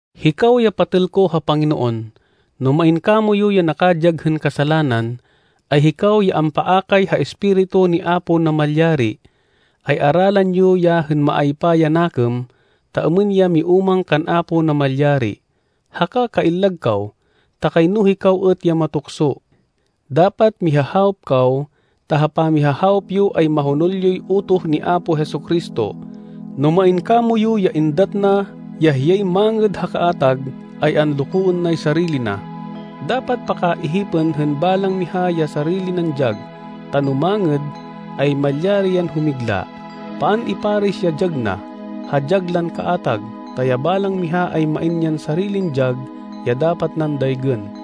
Hikaw ya patêl ko ha Panginoon, no main kamoyu ya nakadyag hên kasalanan, ay hikaw ya ampaakay ha Espiritu ni Apo Namalyari, ay aralan yo ya hên maaypa ya nakêm ta êmên ya miúmang kan Apo Namalyari. Haka kaillag kaw, ta kayno hikaw êt ya matukso. Dapat mihahawop kaw ta ha pamihahawop yo ay mahonol yoy utoh ni Apo Jesu-Cristo. No main kamoyu ya êndat na ya hiyay mangêd ha kaatag, ay anlokoên nay sarili na. Dapat pakaihipên hên balang miha ya sarili nan dyag, ta no mangêd, ay malyari yan humigla. Paan iparis ya dyag na, ha dyag lan kaatag, ta ya balang miha ay main yan sarilin dyag ya dapat nan daygên.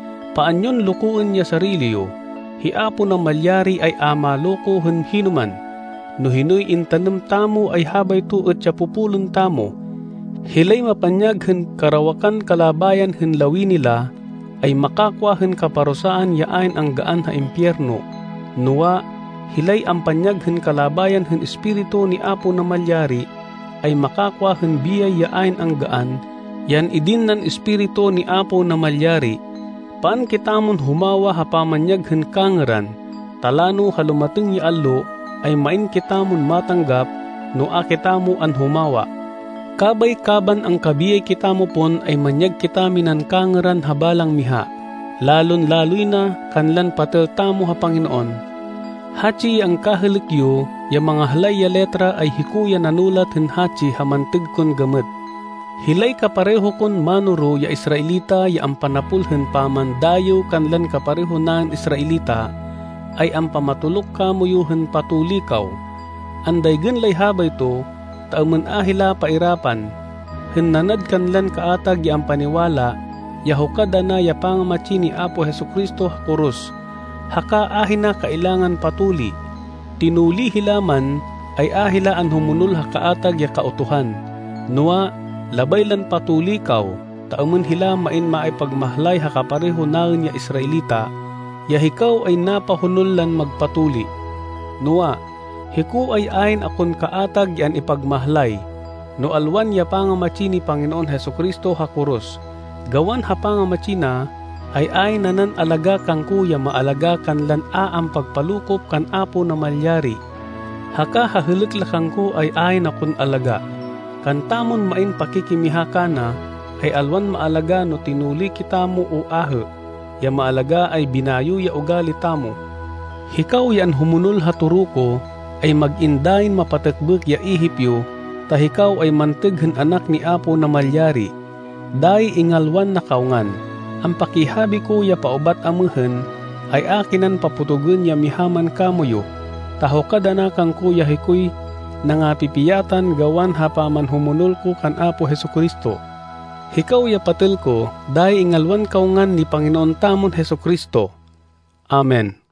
Paan yon lokoên ya sarili yo. Hi Apo Namalyari ay a maloko hên hinoman. No hinoy intanêm tamo ay habayto êt ya popolên tamo. Hilay mapanyag hên karawakan kalabayan hên lawini la, ay makakwa hên kaparusaan ya ayn anggaan ha impiyerno. Noa, hilay ampanyag hên kalabayan hên Espiritu ni Apo Namalyari ay makakwa hên biyay ya ayn anggaan ya an-idin nan Espiritu ni Apo Namalyari. Paan kitamon humawa ha pamanyag hên kangêran, ta lano ha lumatêng ya allo, ay main kitamon matanggap no a kitamo anhumawa. Kabay kaban angkabiyay kitamo pon ay manyag kitaminan kangêran ha balang miha, lalon-laloy na kanlan patêl tamo ha Panginoon. Hatsi ya angkahêlêk yo ya mangahlay ya letra ay hiko ya nanulat hên hatsi ha mantêg kon gamêt. Hilay kapareho kon mánoro ya Israelita ya ampanapol hên pamandayêw kanlan kapareho naên Israelita, ay ampamatoluk kamoyu hên patuli kaw. Andaygên lay habayto ta êmên a hila pairapan, hên nanad kanlan kaatag ya ampaniwala ya hukad ana ya pangamatsi ni Apo Jesu-Cristo ha koros, haka ahina kailangan patuli. Tinuli hila man, ay a hila anhumonol ha kaatag ya Kautuhan. Noa, labay lan patuli kaw, ta êmên hila main maipagmahlay ha kapareho naên ya Israelita, ya hikaw ay napahonol lan magpatuli. Noa, hiko ay ayn akon kaatag ya an-ipagmahlay, no alwan ya pangamatsi ni Panginoon Jesu-Cristo ha koros. Gawan ha pangamatsi na, ay ayn nanan alagá kangko ya maalagá kanlan a ampagpalokop kan Apo Namalyari. Haka ha hêlêk la kangko ay ayn akon alagá. Kantamon main pakikimiha kana, ay alwan maalagá no tinuli kitamo o ahê. Ya maalagá ay binayo ya ugali tamo. Hikaw ya anhumonol ha toro ko, ay mag-in dayin mapatêkbêk ya ihip yo ta hikaw ay mantêg hên anak ni Apo Namalyari. Dayi ingalwan na kaw ngan. Ampakihabi ko ya paubat amêhên, ay a kinan papotogên ya miha man kamoyu, ta hukad ana kangko ya hikoy nangapipiyatan gawan ha pamanhumonol ko kan Apo Jesu-Cristo. Hikaw ya patêl ko, dayi ingalwan kaw ngan ni Panginoon tamon Jesu-Cristo. Amen.